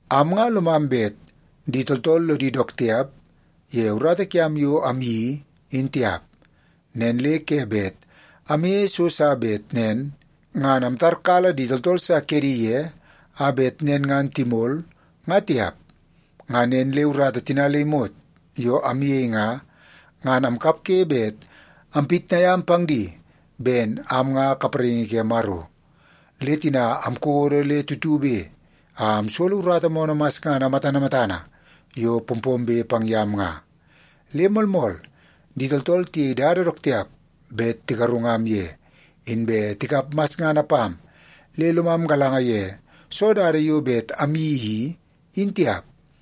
Am nga lomam bet di tooltool lodi dook tiap ye urata kiam yo amyeii, in tiap. Nen le ke bet amyeie so sa bet nen ngan amtarkala di tooltool sa kedi ye a bet nen ngan timol, nga tiap. Ngan nen le urata tina le imot yo amyei nga, ngan amkapge bet ampitnai am pang di ben am nga kapraingi ke Maro. Le tina amkodo le tutube a amsolo urata moonoo masngana matana matana yo pompombe pang yam nga. Le moolmool, di tooltool tiyei dada dook tiap bet tigarungam ye, inbe tikap masngana pam le lomam galanga ye soo dada yo bet amyeii i, in tiap.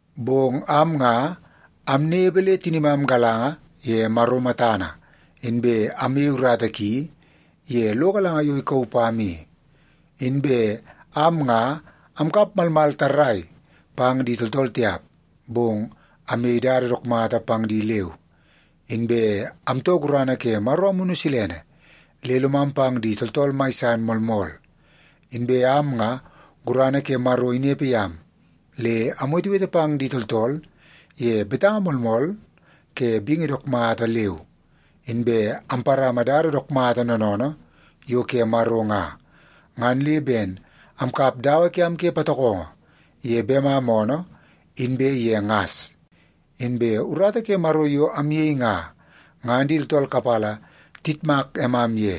Bong am nga amnepe le tinimam galanga ye Maro matana, inbe amyei urata ki ye lo galanga yo ikauu pam i. Inbe am nga amkap malmal tarrai pang di tooltool tiap, bong amyei dada dook mata pang di leu. Inbe amtoo gurana ke Maro Amunu Silene, le lomam pang di tooltool mai san moolmool. Inbe am nga, gurana ke Maro inepe yam le amwetewete pang di tooltool ye betanga moolmool ke bingi dook mata leu. Inbe amparama dada dook mata noonoonoo yo ke Maro nga, ngan le ben amkap dawa kiam ke patokongo ye bemam oonoo inbe ye ngas. Inbe ye urata ke Maro yo amyei nga, ngan di tooltool kapala tiyitmak emam ye,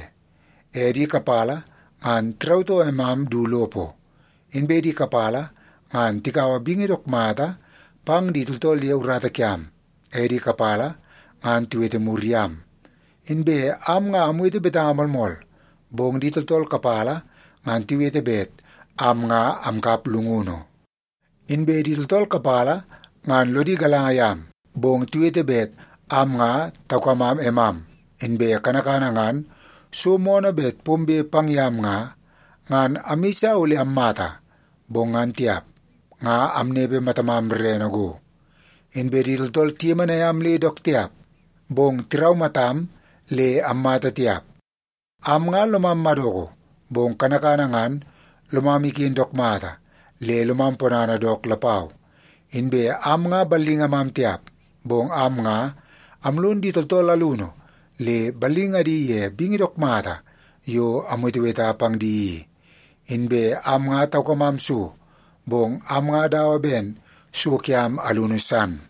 e di kapala ngan tirautoo emam du lopo, inbe di kapala ngan tikaua bingi dook mata pang di tooltool ye urata kiam, e di kapala ngan tiwete mur yam. Inbe am nga amwete betanga moolmool, bong di tooltool kapala ngan tiwete bet am nga amkap llungunu. Inbe di tooltool kapala ngan lodi galanga yam, bong tiwete bet am nga taukamam emam. Inbe kanakana ngan so moonoo bet pombe pang yam nga, ngan amyeisa ole ammata, bong ngan tiap, nga amnepe matamam rrene go. Inbe di tooltool tiyemenai am le dook tiap, bong tiraumatam le ammata tiap. Am nga lomam madoko, bong kanakana ngan lomam iken dook mata le lomam ponana dook lapau. Inbe am nga ballingamam tiap, bong am nga amlon di tooltool alunu le ballingadi ye bingi dook mata yo amweteweta pang di i. Inbe am nga taukamam so, bong am nga dawa ben so kiam alunu san.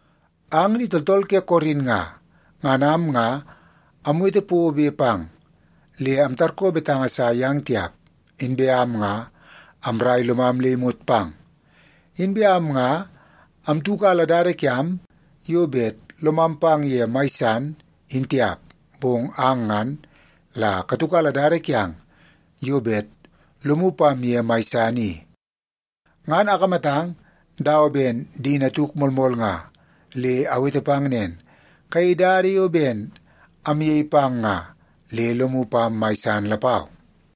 Ang di tooltool ke Korin nga, ngan am nga amwete pobe pang, le amtarkoo betanga sa yang tiap. Inbe am nga amraia lomam le imot pang. Inbe am nga amtiukala dada kiam yo bet lomam pang ye mai san, in tiap, bong ang ngan la katiukala dada kiang yo bet lomu pam ye mai san i. Ngan akamatang dawa ben di natuk moolmool nga, le awete pang nen, kayei dada yo ben amyei pang nga le lomu pam mai san lapau.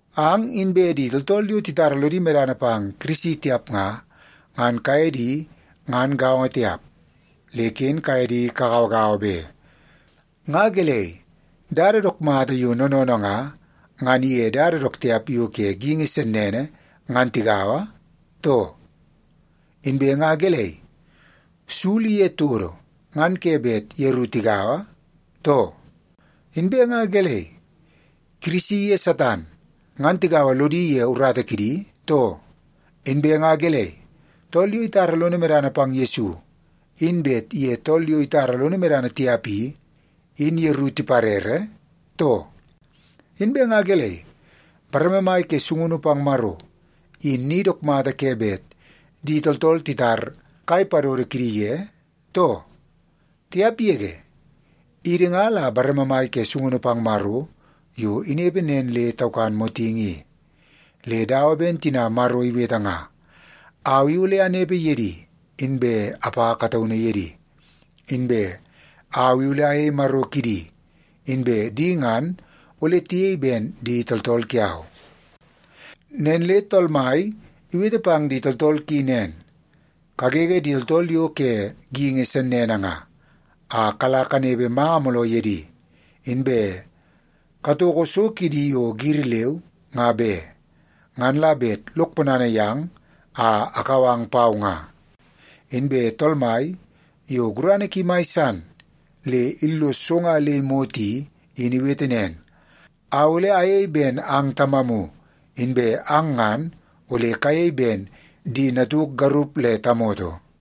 Ang inbe di tooltool yo titara lodi medana pang Kirisi tiap nga, ngan kaye di ngan gaongo tiap, le ken kaye di kagauagaua be. Nga gelei, dada dook mata yo noonoonoo nga, ngan iye dada dook tiap yo ke geingi sennene ngan tigaua, too? Inbe nga gelei, sul iye todo ngan ke bet yeru tigaua, too? Inbe nga gelei, Kirisi iye Satan ngan tigaua lodi ye urata kidi, too? Inbe nga gelei, tool yo itara lono medana pang Yesu in bet iye tool yo itara lono medana tiap i, in yeru tiparere, too? Inbe nga gelei, bareme mai ke sungunu pang Maro, in ni dook mata ke bet di tooltool titar kai padodo kidi ye, too? Tiap yege! Idi nga la bareme mai ke sungunu pang Maro yo inepe nen le taukan motingi i. Le dawa ben tina Maro iwete nga, “Au i ole anepe ye di, inbe apa kataunu ye di. Inbe au i ole ayei Maro kidi, inbe di ngan ole tiyei ben di tooltool kiau.” Nen le Tool Mai iwete pang di tooltool ki nen, “Kagege di tooltool yo ke geingi sennene nga, a kala kanepe manga mooloo ye di. Inbe katoko so kidi yo giri leu, nga be. Ngan la bet lok ponana yang a akau ang pau nga.” Inbe Tool Mai, yo gurana ki mai san le illos so nga le imot i, in iwete nen, “Au ole ayei ben ang Tamamu, inbe ang ngan ole kayei ben di natuk garup le tamoto.”